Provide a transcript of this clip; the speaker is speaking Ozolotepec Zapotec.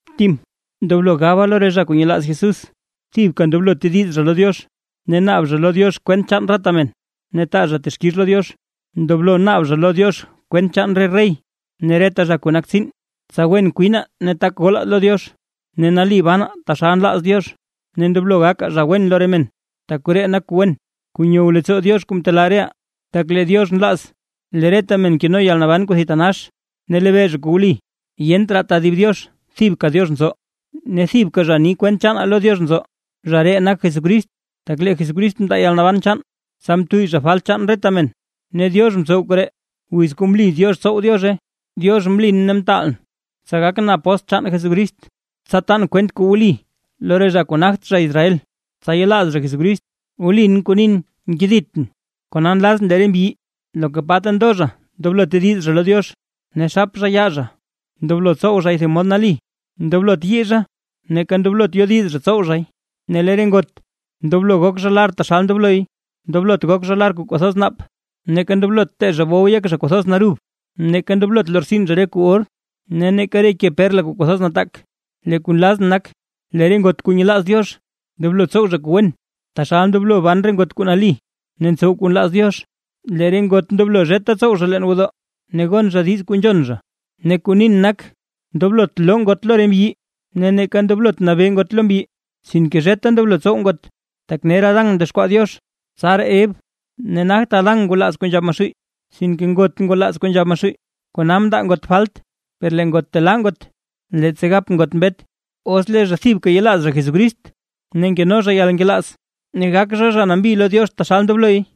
Tim, ndoblo gaba lo re zha kuu nyelaaz Jesús thibka ndoblo tediz zha lo Diox, ne naab zha lo Diox kwent chaan reta men, ne taa zha texkix lo Diox. Ndoblo naab zha lo Diox kwent chaan re rey ne reta zha kuu nak tsiin, tsa wen kwinaa ne tak golaa lo Diox, ne nali bana taxal nlaaz Diox, ne ndoblo gakaa zha wen lo re men. Tak koree nak kuu wen, kuu nyow leettsoo Diox kuu mtelaa reʼaa. Tak lee Diox nlaaz lee reta men keno yalnaban kuu thitanax, ne lebee zha kuu wli. Yent raa tedib Diox thibka Diox nzo, ne thibka zha ni kwent chaanaa lo Diox nzo, zha ree nak Jesucrist. Tak lee Jesucrist mndaa yalnaban chaan, tsa mtuyy zha falt chaan reta men, ne Diox mtsow koree wiz kuu mli Diox tsow Diozhe. Diox mlin ne mtaalʼn, tsa gakʼn apóstl chaan Jesucrist, tsa tan kwent kuu wli lo re zha kuu nagt zha Israel, tsa yelaaz zha Jesucrist. Wlin kuu nin nkeditʼn. Kona nlazʼn lee re mbyi, loka ta ndo zha ndoblo tediz zha lo Diox, ne xap zha yaa zha. Ndoblo tsow zhay thib mod nali, ndoblot yii zha neeka ndoblot yodiz zha tsow zhay. Ne lee re ngot ndoblo zha gok zha lar taxal ndobloy; ndoblot gok zha lar kuu kwathoz naap neeka ndoblot tee zha bow yek zha kwathoz narub. Neeka ndoblot lortsin zha re kuu or ne neeka re ke perla kuu kwathoz nataak. Lee kuu nlazʼn nak: Lee re ngot kuu nyelaaz Diox, ndoblo tsow zha kuu wen, taxal ndoblo ban re ngot kuu nali ne ntsow kuu nlaaz Diox. Lee re ngot ndoblo zheta tsow zha leen gwodoo, ne gon zha diiz kuu nzhon zha. Ne kuu nin nak, ndoblot loo ngot lo re mbyi ne neeka ndoblot nabee ngot lo mbyi, sinke zheta ndoblo tsow ngot. Tak ner Adán mdexkwaa Diox, tsaraa Ev; ne nagt Adán ngwalaaz kuu nzhab Maxuuy, sinke ngot ngwalaaz kuu nzhab Maxuuy, kona mndaa ngot falt. Per lee ngot telaa ngot, leettsa gap ngot mbet, os lee zha thibka yelaaz zha Jesucrist, ne nkeno zha yalnkelaaz, ne gak zha, zha nambi lo Diox taxal ndobloy.